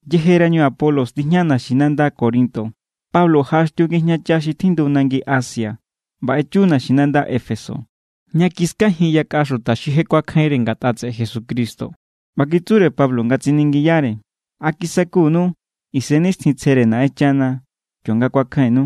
Yejerañu Apolos tijña naxinanda Corinto, Pablo jaꞌaxtiu ngijñacha xi tjindu nangi Asia ꞌba echu naxinanda Éfeso, ña kiskajin yakꞌa xuta xi je kuakjainre ngatꞌa tseꞌe Jesucristo. ꞌBa kitsure Pablo nga tsiningiyare: —¿A kisakunu Isennixtjintsjere Naꞌenchana kionga kuakjainnu?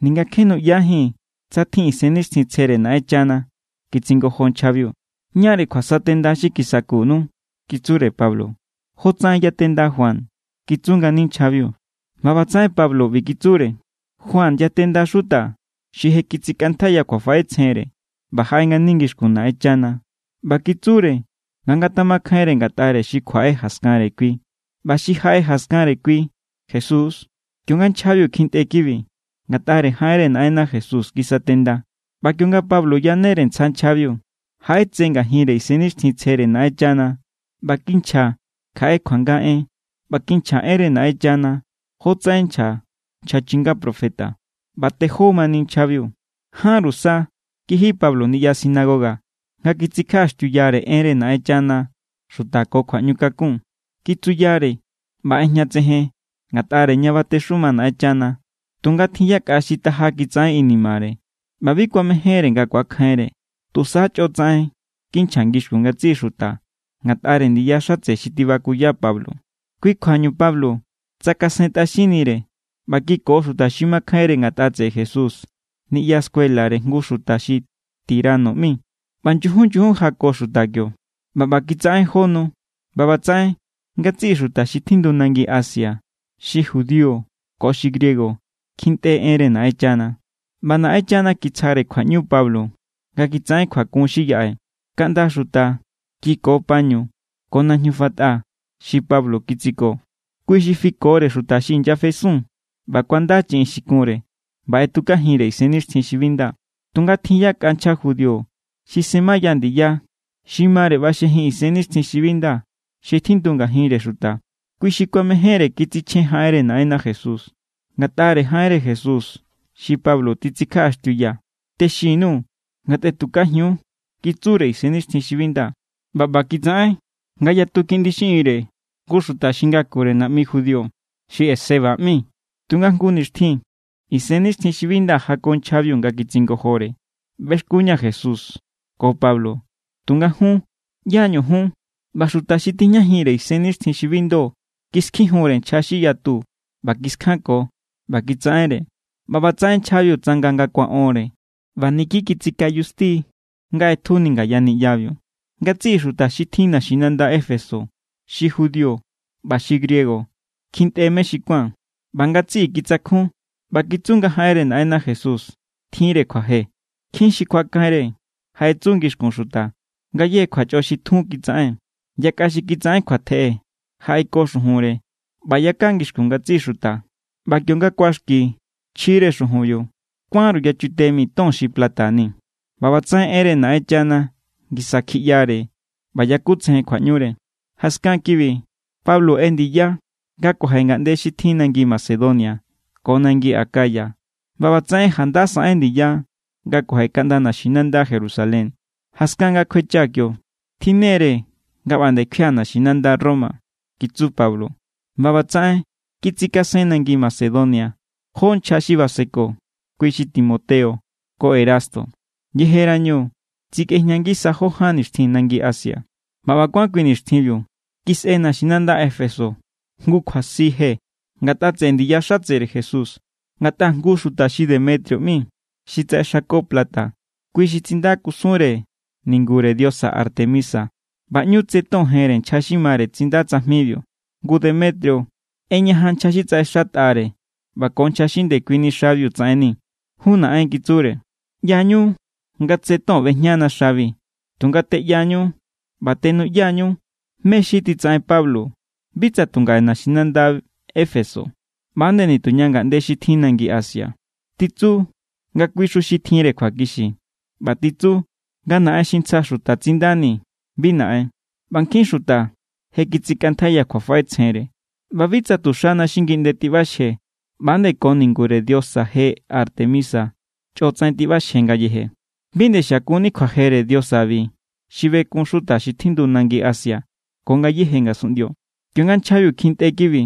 —Ninga kje nuꞌyajíi̱n tsa tjin Isennixtjintsjere Naꞌenchana —kitsingojo nchjabiu. —¿Ñáre kjuasatenda xi kisakunu? —kitsure Pablo. —Jotsaꞌen yatenda Juan —kitsu ngani nchjabiu. ꞌBa ꞌbatsaꞌen Pablo ꞌbi kitsure: —Juan yatenda xuta xi je kitsikꞌantjaiya kjuafaꞌetsjenre ꞌba jaꞌe ngani ngixkun Naꞌenchana ꞌba kitsure nga ngatamakjainre ngatꞌare xi kjuaꞌe jaskanre kui. ꞌBa xi jaꞌe jaskanre kui, Jesús=. Kionga nchjabiu kjintꞌe kibi, ngatꞌare jaꞌenre Naꞌenna Jesús kisatenda. ꞌBa kionga Pablo yanere ntsja nchjabiu, jaꞌetse ngajinre Isennixtjintsjere Naꞌenchana ꞌba kinchja kjaꞌe kuanga en ꞌba kinchja enre Naꞌenchana jotsaꞌen nchja nchja chinga profeta. ꞌBa tejó mani nchjabiu. Jánru sa kiji Pablo niꞌya sinagoga nga kitsikjaꞌaxtiuyare enre Naꞌenchana xuta ko kjuaꞌñukakun. Kitsuyare ꞌba ꞌejñatsejen ngatꞌare ña batexuma Naꞌenchana. Tunga tjin yakꞌa xi taja kitsaꞌen inimare ꞌba bi kuamejénre nga kuakjainre. Tusa chꞌo tsaꞌen kinchja ngixkun ngatsiꞌi xuta ngatꞌare ndiya xatse xi tibakuya Pablo. Kui kjuañu Pablo tsakasentꞌaxinnire ꞌba kiko xuta xi makjainre ngatꞌa tseꞌe Jesús niꞌya scuelare jngu xuta xi Tirano ꞌmi. ꞌBa nyujun nyujun jako xuta kio. ꞌBa ꞌba kitsaꞌen jó nu, ꞌba ꞌbatsaꞌen ngatsiꞌi xuta xi tjindu nangi Asia, xi judío ko xi griego, kjintꞌe enre Naꞌenchana. ꞌBa Naꞌenchana kitsjare kjuaꞌñu Pablo nga kitsaꞌen kjuakun xi yaꞌe. Kaꞌnda xuta kiko pañu ko najñu fatꞌa xi Pablo kitsiko. Kui xi fikore xuta xi inyafesun, ꞌba kuanda chiꞌin xi kunre ꞌba ꞌetukajinre isennixtjin xi bi nda. Tunga tjin yakꞌa nchja judío xi semaya ndiya xi mare ꞌbaxjejin isennixtjin xi bi nda xi tjindu ngajinre xuta. Kui xi kuamejénre kitsichjen jaꞌenre Naꞌenna Jesús: —Ngatꞌare jaꞌenre Jesús xi Pablo titsikjaꞌaxtiuya, texin_nuu̱ nga tꞌetukajiun —kitsure isennixtjin xi bi nda. ꞌBa ꞌba kitsaꞌen ngayatu kiꞌndi xiꞌinre jngu xuta xi ngakure naꞌmi judío xi Esceva ꞌmi. Tunga jngu nixtjin isennixtjin xi bi nda jako nchjabiu nga kitsingojore: —ꞌBexkunña̱ Jesús ko Pablo, tunga jun, ¿ꞌyá=ñu jun? ꞌBa xuta xi tijñajinre isennixtjin xi bi ndo kiskjijunre nchja xi yatu ꞌba kiskjanko ꞌba kitsaꞌenre. ꞌBa ꞌbatsaꞌen nchjabiu tsanga nga kuaꞌonre ꞌba niki kitsikayusti= nga ꞌetjuni ngaya niꞌyabiu. Ngatsiꞌi xuta xi tjin naxinanda Éfeso, xi judío ꞌba xi griego, kjintꞌe mé xi kuán. ꞌBa ngatsiꞌi kitsakjun ꞌba kitsu nga jaꞌenre Naꞌenna Jesús tjinre kjuaje. Nkjin xi kuakjainre jaꞌetsu ngixkun xuta ngayéje kjuachꞌo xi tjun kitsaꞌen. Yakꞌa xi kitsaꞌen kjuatjeꞌe jaꞌeko xujunre ꞌba yaka ngixkun ngatsiꞌi xuta. ꞌBa kionga kuaxki chjire xujunbiu, kuánru yachute mi ton xi plata ni. ꞌBa ꞌbatsaꞌen enre Naꞌenchana ngisa kjiꞌyare ꞌba yakutsejen kjuaꞌñure. Jaskan kibi Pablo ꞌendiya nga kuaje ngaꞌnde xi tjin nangi Macedonia ko nangi Acaya ꞌba ꞌbatsaꞌen janda saꞌen ndiya nga kuaje kaꞌnda naxinanda Jerusalén. —Jaskan nga kjuechaa̱ kio, tjinnere nga ꞌba nde kjuia̱ naxinanda Roma —kitsu Pablo. ꞌBa ꞌbatsaꞌen kitsikasen nangi Macedonia jó nchja xi baseko, kui xi Timoteo ko Erasto. Yejerañu, tsikꞌejña ngisa jó ján nixtjin nangi Asia. ꞌBa ꞌba kuán kui nixtjinbiu, kisꞌe naxinanda Éfeso jngu kjuasi je ngatꞌa tseꞌe ndiya xatsere Jesús. Ngatꞌa jngu xuta xi Demetrio ꞌmi, xi tsaꞌexako plata, kui xi tsinda kusunre ningure diosa Artemisa. ꞌBa ꞌñu tse ton jenre nchja xi mare tsinda tsajmibiu. Ngu Demetrio ꞌeñajan nchja xi tsaꞌexatꞌare ꞌba ko nchja xi ndekuini xabiu tsaꞌenni. —Jun naꞌen —kitsure—, ꞌya=ñu nga tse ton ꞌbejñana xabi. Tunga teꞌyañu ꞌba tenuꞌya=ñu mé= xi titsaꞌen Pablo bi tsa tu ngaꞌe naxinanda Éfeso ꞌba=nde nituña ngaꞌnde xi tjin nangi Asia. Titsu nga kuixu xi tjinre kjuakixi, ꞌba titsu nga naꞌen xi ntsjaxu xuta tsindani bi naꞌen. ꞌBa nkjin xuta je kitsikꞌantjaiya kjuafaꞌetsjenre. ꞌBa bi tsa tu xana xi ngiꞌnde tiꞌbaxje, ꞌba=nde ko ningure diosa je Artemisa chꞌo tsaꞌen tiꞌbaxje ngayeje. Bi nde xiakunni kjuajere diosabi xi bekun xuta xi tjindu nangi Asia ko ngayéje ngasunꞌndio. Kionga nchjabiu kjintꞌe kibi,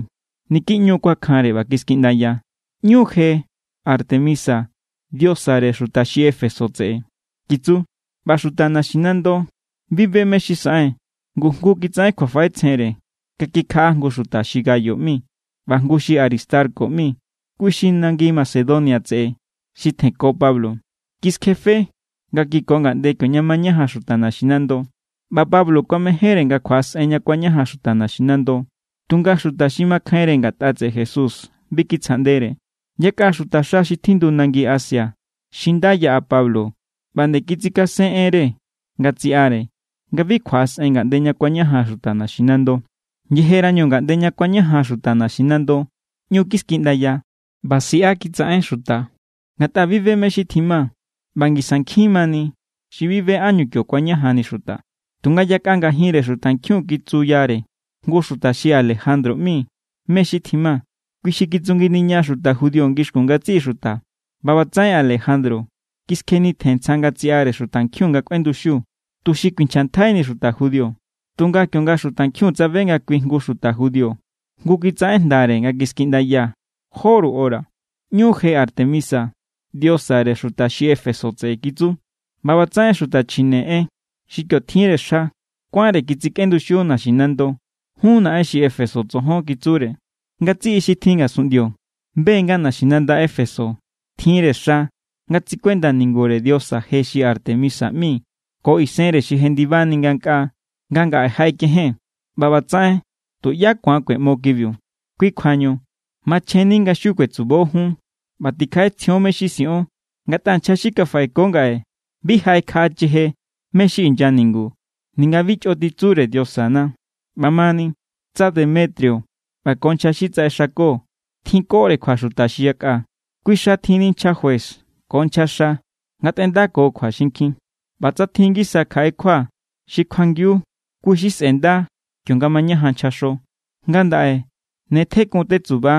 niki ꞌñu= kuakjanre ꞌba kiskiꞌndaya: —¡ꞌÑu je Artemisa diosare xuta xi Éfeso tseꞌe! —kitsu. ꞌBa xuta naximando, bi be mé= xi saꞌen. Ngu jngu kitsaꞌen kjuafaꞌetsjenre nga kikjaꞌa jngu xuta xi Gayo ꞌmi ꞌba jngu xi Aristarco ꞌmi, kui xi nangi Macedonia tseꞌe xi tjenko Pablo. Kiskjefe nga kiko ngaꞌnde kioña mañajan xuta naxinando. ꞌBa Pablo kuamejénre nga kjuaꞌasꞌen ña kuañajan xuta naxinando, tunga xuta xi makjainre ngatꞌa tseꞌe Jesús bi kitsjaꞌndere. Yakꞌa xuta xa xi tjindu nangi Asia xi nda yaꞌa Pablo ꞌba nde kitsikasen enre nga tsiꞌare nga bi kjuaꞌasꞌen ngaꞌnde ña kuañajan xuta naxinando. Yejerañu ngaꞌnde ña kuañajan xuta naxinando, ꞌñu kiskiꞌndaya ꞌba siꞌa kitsaꞌen xuta, ngatꞌa bi be mé= xi tjima ꞌba ngisa nkjin mani xi bi be ánñu kio kuañajanni xuta. Tunga yakꞌa ngajinre xutankjiun kitsuyare jngu xuta xi Alejandro ꞌmi mé= xi tjima. Kui xi kitsunginiña xuta judío ngixkun ngatsiꞌi xuta. ꞌBa ꞌbatsaꞌen Alejandro kiskjenitjen ntsja nga tsiꞌare xutankjiun nga kꞌuenduxiu, tuxi kuinchjantjaini xuta judío. Tunga kionga xutankjiun tsabe nga kui jngu xuta judío, jngu kitsaꞌen jndare nga kiskiꞌndaya jóru hora: —¡ꞌÑu je Artemisa diosare xuta xi Éfeso tseꞌe! —kitsu. ꞌBa ꞌbatsaꞌen xuta chjine en xi kio tjinre xa kuánre kitsikꞌenduxiu naxinando. —Jun naꞌen xi Éfeso tsojon —kitsure—, ngatsiꞌi xi tjin ngasunꞌndio be= nga naxinanda Éfeso tjinre xa nga tsikuenda ningure diosa je xi Artemisa ꞌmi ko isenre xi jendibani ngankꞌaa nga ngaꞌe jaꞌekejen. ꞌBa ꞌbatsaꞌen tuꞌyá ku̱an kueꞌmo kibi. Kui= kjuañu machjenni nga xiu kuetsubo jun ꞌba tikjaꞌetsjion mé= xi siꞌon. Ngatꞌa nchja xi kafaꞌeko ngaꞌe bi jaꞌekjaꞌacheje mé= xi inya ningu ninga bi chꞌo titsure diosana. ’ꞌBamani, tsa Demetrio ꞌba ko nchja xi tsaꞌexako tjinkore kjua xuta xi yakꞌa, kui xa tjinni nchja juez ko nchjaxa ngatꞌendako kjua xinkjin. ꞌBa tsa tjin ngisa kjaꞌe kjua xi kjuangiu, kui= xi sꞌe̱nda kionga mañajan nchjaxo. Ngandaꞌe ne tjekun tetsuba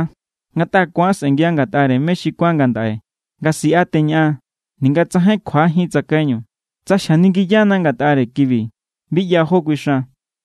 ngatꞌa ku̱an sꞌe̱ngia ngatꞌare mé xi kuán ngandaꞌe nga siꞌa teñaꞌan ninga tsajain kjuajín tsakaiñu. Tsa xjaningiyana ngatꞌare kibi, bi ꞌya jó kuixan.